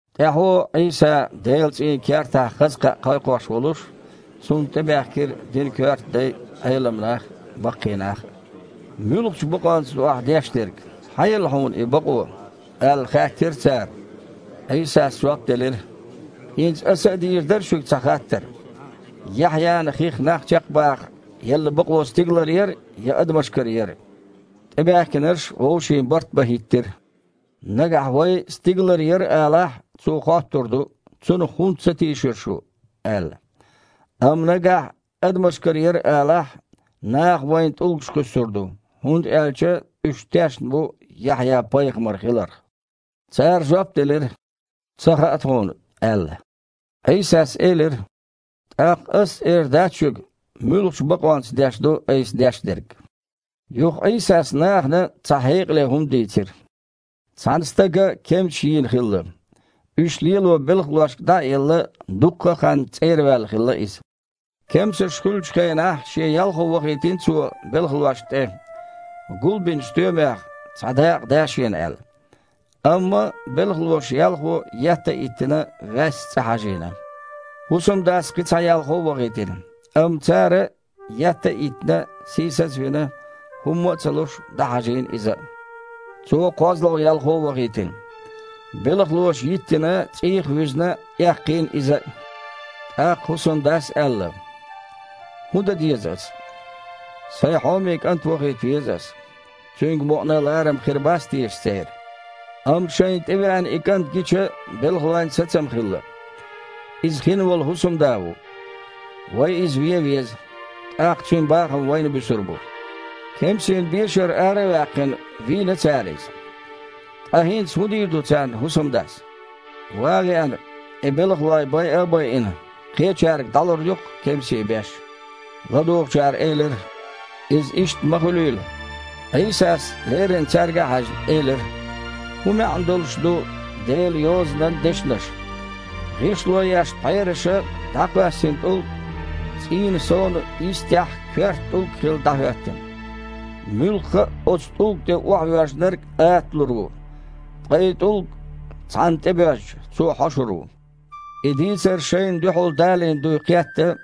ТІаьхьо, Іийса Делан цІийнан кертахь хаза кхаъ кхайкхош волуш, Цунна тІебаьхкира динан коьрта дай а, Іелам нах а, баккхий нах а. «Муьлхачу бакъонца ду Ахь деш дерг? Хьан елла Хьуна и бакъо?» – аьлла, хаьттира цара. Іийсас жоп делира: «ХІинца Аса а дийр дара шуьга цхьа хаттар: Яхьъяна хих нах чекхбаха елла бакъо стигалара яра я адамашкара яра?» ТІебаьхкинарш вовшийн барт бан хІиттира: «Нагахь вай: „Стигалара яра“, алахь, Цо хоттур ду: „Цунах хІунда ца тийшира шу?“ – аьлла. Амма нагахь: „Адамашкара яра“, – алахь, наха вайна тІулгаш кхуьссур ду, хІунда аьлча уьш тешна бу Яхьъя пайхамар хиларх». Цара жоп делира: «Ца хаьа тхуна», – аьлла. Іийсас элира: «ТІаккха Ас а эр дац шуьга, муьлхачу бакъонца деш ду Айса деш дерг». Юха Іийсас нахана цхьа хьекъале хІума дийцира: «Цхьана стага кемсаш йийна хилла. Уьш лело белхалошка дІа а елла, дуккха а ханна цІера ваьлла хилла иза. Кемсаш хуьлучу хенахь шен ялхо вахийтина цо белхалошна тІе, гулбинчу стоьмех цхьа дакъа да шена аьлла. Амма белхалоша ялхо, етта а йиттина, ваьсса цІа хьажийна. ХІусамдас кхин цхьа ялхо а вахийтина, амма цара, етта а йиттина, сийсаз а вина, хІумма а ца луш, дІахьажийна иза а. Цо кхозлагІа ялхо вахийтина. Белхалоша йиттина, цІийх а вуьзна, эккхийна иза а. ТІаккха хІусамдас аьлла: „ХІун дан деза ас? Сайн хьоме кІант вахийта веза ас, цуьнга мукъана а ларам хир бац теша церан?“ Амма шайна тІевеана и кІант гича, белхалойн сацам хилла: „Иза хинволу хІусамда ву. Вай иза вен веза, тІаккха цуьнан бахам вайна буьсур бу“. Кемсийн бешара ара а ваьккхина, вийна цара иза. Ткъа хІинца хІун дийр ду царна хІусамдас? Ван а веана, и белхалой байа а байина, кхечаьрга дІалур ю-кх кемсийн беш». ЛадугІучара элира: «Иза иштта ма хуьлийла!» Іийсас, леррина цаьрга а хьаьжна, элира: «ХІун маьІна долуш ду Делан Йозанан дешнаш: „ГІишло еш пхьераша дІакхоьссина тІулг цІийнан сонан йистехь коьрта тІулг хилла, дІахІоьттина“? Муьлхха а оцу тІулга тІе охьавоьжнарг аталур ву, ткъа и тІулг цхьанна тІе боьжча, цо хьошур ву». И дийцар шайна дуьхьал далийна дуй кхетта,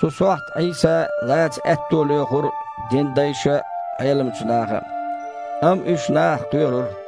цу сохьта Іийса лаца аьтто лоьхура динан дайша а, Іеламчу наха а. Амма уьш нахах кхоьрура.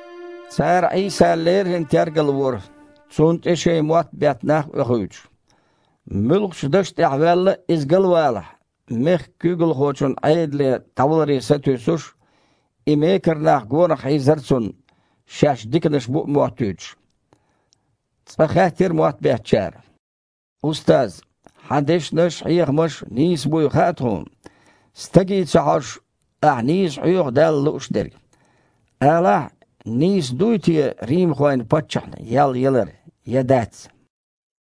Цара Іийса леррина тергалвора, Цунна тІе шайн мотт бетта нах а оьхуьйтуш. Муьлххачу даша тІехь ваьлла а Иза галвалахь, мехкан куьйгалхочун Іедале дІаваларе сатуьйсуш, и мекара нах гонах хьийзара Цунна, шаьш диканаш бу а моттуьйтуш. Цкъа хаьттира мотт беттачара: «Устаз! Хьан дешнаш а, хьехамаш а нийса буй хаьа тхуна. Стаге ца хьожуш, Ахь нийса хьоьху Далла лууш дерг. Алахьа, нийса дуй те римхойн паччахьна ял ялар я дац?»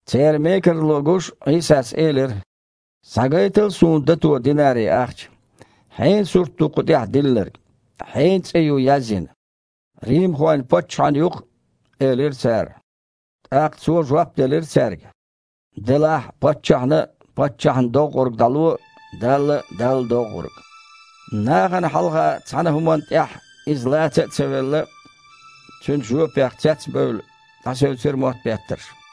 Церан мекарло гуш, Іийсас элира: «Схьагайтал Суна дато динари-ахча. Хьенан сурт ду кху тІехь диллинарг, хьенан цІе ю язйина?» «Римхойн паччахьан ю-кх», – элира цара. ТІаккха Цо жоп делира цаьрга: «Делахь, паччахьна паччахьна доггІург дІало, Далла – Далла доггІург». Нахана хьалха цхьана а хІуманна тІехь Иза лаца а ца велла, Цуьнан жоьпах цецбевлла, дІасевцира мотт беттарш.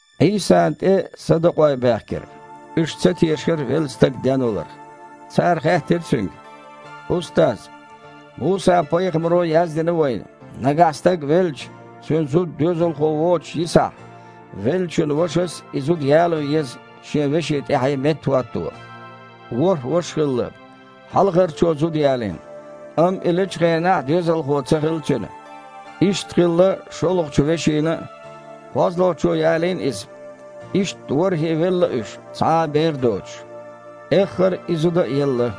Іийсана тІе садукъой баьхкира. Уьш ца тешара велла стаг денваларх. Цара хаьттира Цуьнга: «Устаз! Муса-пайхамаро яздина вайна, нагахь стаг велча, цуьнан зуда доьзалхо воцуш йисахь, веллачун вашас и зуда яло еза шен вешин тІаьхье меттахІотто. ВорхІ ваша хилла. Хьалхарчо зуда ялийна, амма и лечу хенахь доьзалхо ца хилла цуьнан. Иштта хилла шолгІачу вешина а. КхозлагІчо ялийна иза, иштта ворхІе а велла уьш, цхьа а бер доцуш. Эххар и зуда а елла.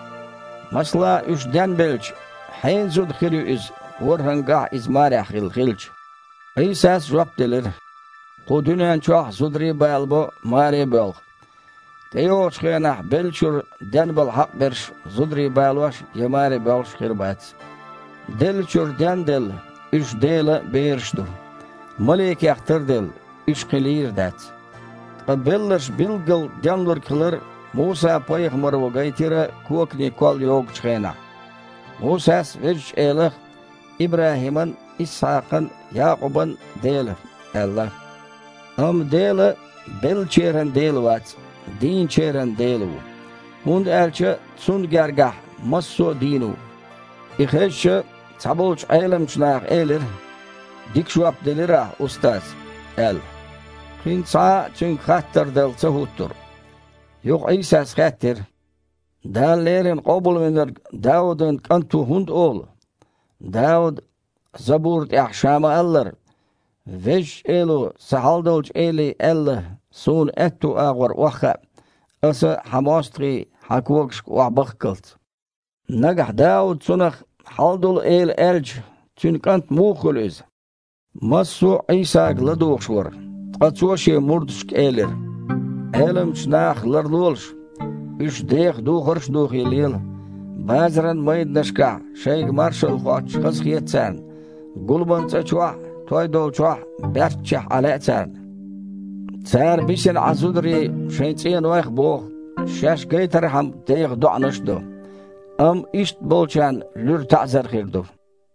Масала, уьш денбелча, хьенан зуда хир ю иза, ворхІангахь а иза марехь хилла хилча?» Іийсас жоп делира: «Кху дуьнен чохь зударий а балабо, маре а боьлху. ТІейогІучу хенахь беллачуьра денбала хьакъ берш зударий балош я маре боьлхуш хир бац. Деллачуьра ден а делла, уьш Делан бераш ду. Маликех тарделла, уьш кхин лийр дац. Ткъа белларш билггала денлург хилар Муса-пайхамаро гайтира коканийн колл йогучу хенахь. Мусас Везачу Элах „ИбрахІиман а, Исхьакхан а, Якъубан а Дела“ аьлла. Амма Дела беллачеран Дела вац, дийначеран Дела ву, хІунда аьлча Цунна гергахь массо а дийна ву!» И хезча, цхьаболчу Іеламчу наха элира: «Дика жоп делира Ахь, Устаз!» – аьлла. Кхин цхьа а Цуьнга хаттар дала ца хІуттура. Юха Іийсас хаьттира: « Дала леррина Къобалвинарг Даудан КІант ву хІунда олу? Дауда забура тІехь ша ма-аллара: „Везачу Эло сан Хьалдолчу Эле аьлла: Суна аьтту агІор охьахаа, Аса Хьан мостагІий Хьан когашка охьабахккалц“. Нагахь Дауда Цунах „Хьалдолу Эла“ аьлча, цуьнан кІант муха хуьлу Иза?» Массо а Іийсага ладугІуш вара, ткъа Цо Шен мурдашка элира: «Іеламчу нахах ларлолаш. Уьш деха духарш духий лела, базаран майданашкахь шайга маршалла хоттуш хазахета царна, гуламан цІа чохь а, той долчохь а баьрччехь Іан лаьа царна. Цара бисина Іан зударий шайн цІенойх а боху, шаьш гайтархьама деха доІанаш а до. Амма иштта болчарна луьра таІзар хир ду».